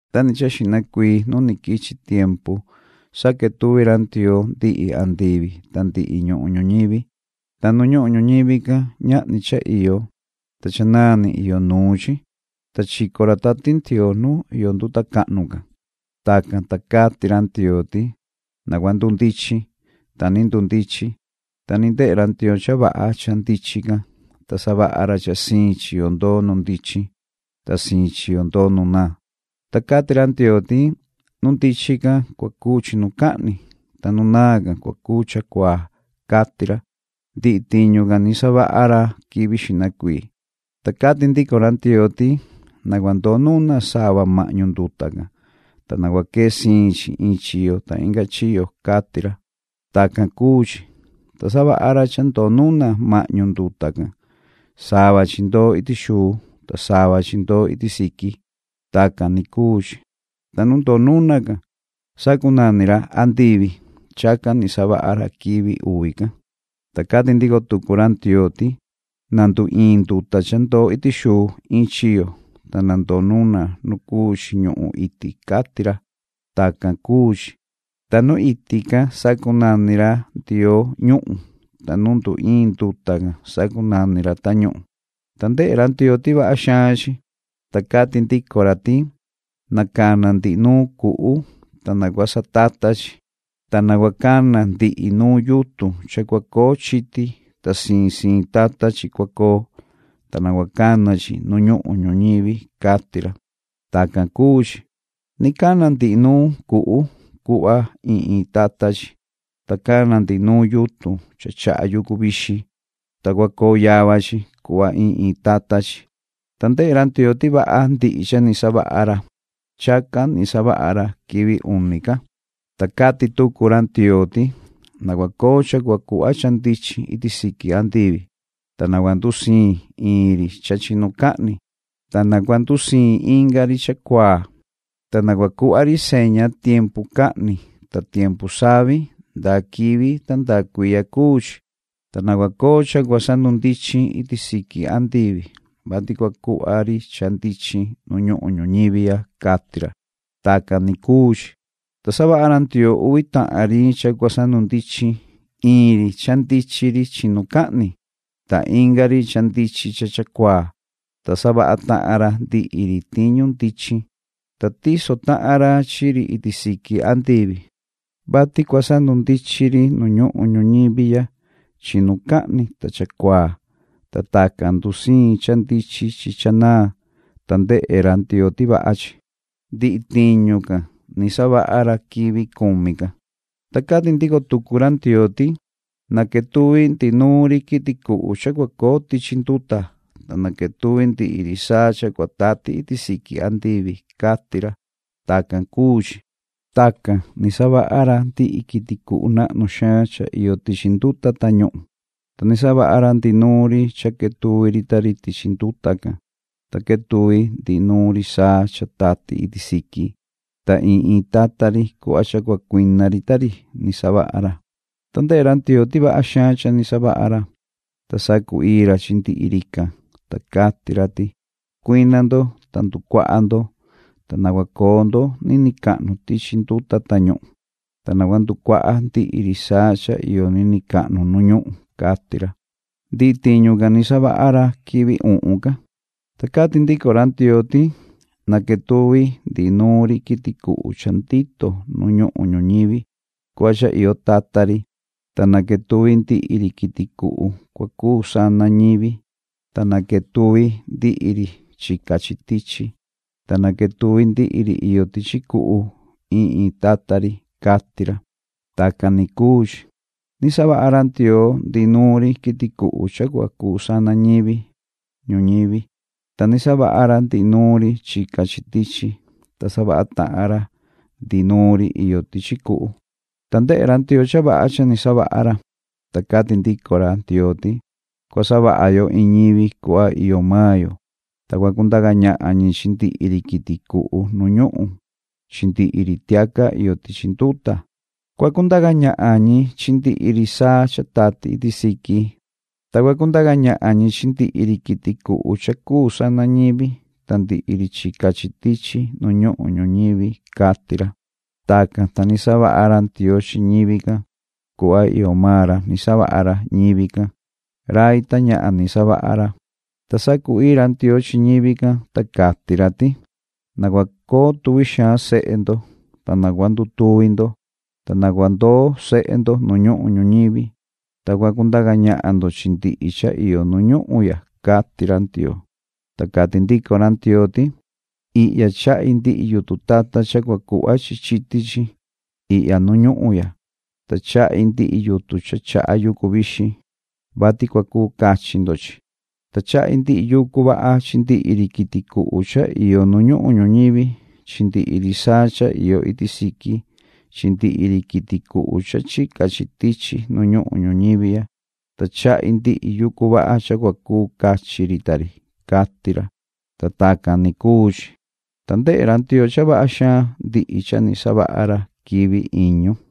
Nda ni cha xihna cuii nu ni quichi tiempu saquetuvi ra Ndioo ndihi andivi ta ndihi ñuhun ñuñivi. Ta nu ñuhun ñuñivi can ñahni cha iyo, ta cha naan ni iyo nuun chi. Ta chico ra Tati Ndioo nu iyo nduta cahnu can. Tacan, ta cati ra Ndioo ti: “Na cua ndundichin.” Ta ni ndundichin. Ta ni ndehe ra Ndioo cha vaha cha ndichin can, ta savaha ra cha siin chiyo ndoo nu ndichin, ta siin chiyo ndoo nu naan. Ta cati ra Ndioo ti: Nu ndichin can cua cuu “chinucahni”, ta nu naan can cua cuu “chacuaa”, cati ra. Ndihi tiñu can ni savaha ra quivi xihna cuii. Ta cati ndico ra Ndioo ti: “Na cua ndoo nuna sava mahñu nduta can, ta na cua quee siin chi in chiyo ta inga chiyo”, cati ra. Tacan cuu chi. Ta savaha ra cha ndoo nuna mahñu nduta can. Sava chi ndoo iti xuu, ta sava chi ndoo iti siqui. Tacan ni cuu chi. Ta nu ndoo nuna can sacunani ra “andivi”. Chacan ni savaha ra quivi uvi can. Ta cati ndico tucu ra Ndioo ti: “Na nduiin nduta cha ndoo iti xuu in chiyo, ta na ndoo nuna nu cuu chi ñuhun iti”, cati ra. Tacan cuu chi. Ta nu iti can sacunani ra Ndioo “ñuhun”, ta nu nduiin nduta can sacunani ra “tañuhun”. Ta ndehe ra Ndioo ti vaha xaan chi. Ta cati ndico ra ti: “Na cana ndihi nuun cuhu, ta na cua satata chi. Ta na cua cana ndihi nuun yutun cha cua coo chiti, ta siin siin tata chi cua coo, ta na cua cana chi nu ñuhun ñuñivi”, cati ra. Tacan cuu chi. Ni cana ndihi nuun cuhu cuhva in in tata chi, ta cana ndihi nuun yutun cha chaha yucu vixin, ta cua coo yava chi cuhva in in tata chi. Ta ndehe ra Ndioo ti vaha ndihi cha ni savaha ra. Chacan ni savaha ra quivi uni can. Ta cati tucu ra Ndioo ti: “Na cua coo cha cua cuhva cha ndichin iti siqui andivi, ta na cua ndusiin in ri cha chinucahni, ta na cua ndusiin inga ri chacuaa. Ta na cuhva ri seña tiempu cahni ta tiempu savi ndaa quivi ta ndaa cuiya cuu chi. Ta na cua coo cha cua sandundichin iti siqui andivi, vati cua cuhva ri cha ndichin nu ñuhun ñuñivi ya”, cati ra. Tacan ni cuu chi. Ta savaha ra Ndioo uvi tahan ri cha cua sandundichin, in ri cha ndichin ri chinucahni ta inga ri cha ndichin cha chacuaa. Ta savaha tahan ra ndihi ri tiñu ndichin. Ta tiso tahan ra chi ri iti siqui andivi, vati cua sandundichin ri nu ñuhun ñuñivi ya chinucahni ta chacuaa, ta tacan ndusiin cha ndichin chi cha naan. Ta ndehe ra Ndioo ti vaha chi. Ndihi tiñu can savaha ra quivi cumi can. Ta cati ndico tucu ra Ndioo ti: “Na quetuvi ndihi nuun ri quiti cuhu cha cua coo tichi nduta, ta na quetuvi ndihi ri saa cha cua tati iti siqui andivi”, cati ra. Tacan cuu chi. Tacan ni savaha ra ndihi quiti cuhu nahnu xaan cha iyo tichi nduta tañuhun, ta ni savaha ra ndihi nuun ri cha quetuvi ri ta ri tichi nduta can, ta quetuvi ndihi nuun ri saa cha tati iti siqui. Ta in in tata ri cuhva cha cua cuina ri ta ri ni savaha ra. Ta ndehe ra Ndioo ti vaha xaan cha ni savaha ra. Ta sacu-ii ra chi ndihi rican, ta cati ra ti: “Cuina ndo, ta nducuaha ndo, ta na cua coo ndo niniin cahnu tichi nduta tañuhun, ta na cua nducuaha ndihi ri saa cha iyo niniin cahnu nu ñuhun”, cati ra. Ndihi tiñu can savaha ra quivi uhun can. Ta cati ndico ra Ndioo ti: “Na quetuvi ndihi nuun ri quiti cuhu cha ndito nu ñuhun ñuñivi cuhva cha iyo tata ri, ta na quetuvi ndihi ri quiti cuhu cua cuu sana ñivi, ta na quetuvi ndihi ri chica chi tichi, ta na quetuvi ndihi ri iyo tichi cuhu in in tata ri”, cati ra. Tacan ni cuu chi. Ni savaha ra Ndioo ndihi nuun ri quiti cuhu cha cua cuu sana ñivi ñuñivi, ta ni savaha ra ndihi nuun ri chica chi tichi, ta savaha tahan ra ndihi nuun ri iyo tichi cuhu. Ta ndehe ra Ndioo cha vaha cha ni savaha ra. Ta cati ndico ra Ndioo ti: “Cua savaha yo in ñivi cuhva iyo maan yo, ta cua cundaca ñahan ñi chi ndihi ri quiti cuhu nu ñuhun chi ndihi ri tiaca iyo tichi nduta. Cua cundaca ñahan ñi chi ndihi ri saa cha tati iti siqui, ta cua cundaca ñahan ñi chi ndihi ri quiti cuhu cha cuu sana ñivi ta ndihi ri chica chi tichi nu ñuhun ñuñivi”, cati ra. Tacan, ta ni savaha ra Ndioo chi ñivi can. Cuhva iyo maan ra ni savaha ra ñivi can, rai ta ñahan ni savaha ra. Ta sacu-ii ra Ndioo chi ñivi can, ta cati ra ti: “Na cua coo tuvi xaan sehe ndo, ta na cua ndutuvi ndo, ta na cua ndoo sehe ndo nu ñuhun ñuñivi, ta cua cundaca ñahan ndo chi ndihi cha iyo nu ñuhun ya”, cati ra Ndioo. Ta cati ndico ra Ndioo ti: “Ihya chahi ndihi yutun tata cha cua cuhva chi chiti chi ihya nu ñuhun ya, ta chahi ndihi yutun cha chaha yucu vixin, vati cua cuu cachi ndo chi. Ta chahi ndihi yucu vaha chi ndihi ri quiti cuhu cha iyo nu ñuhun ñuñivi chi ndihi ri saa cha iyo iti siqui chi ndihi ri quiti cuhu cha chica chi tichi nu ñuhun ñuñivi ya, ta chahi ndihi yucu vaha cha cua cuu cachi ri ta ri”, cati ra. Ta tacan ni cuu chi. Ta ndehe ra Ndioo cha vaha xaan ndihi cha ni savaha ra quivi iñu.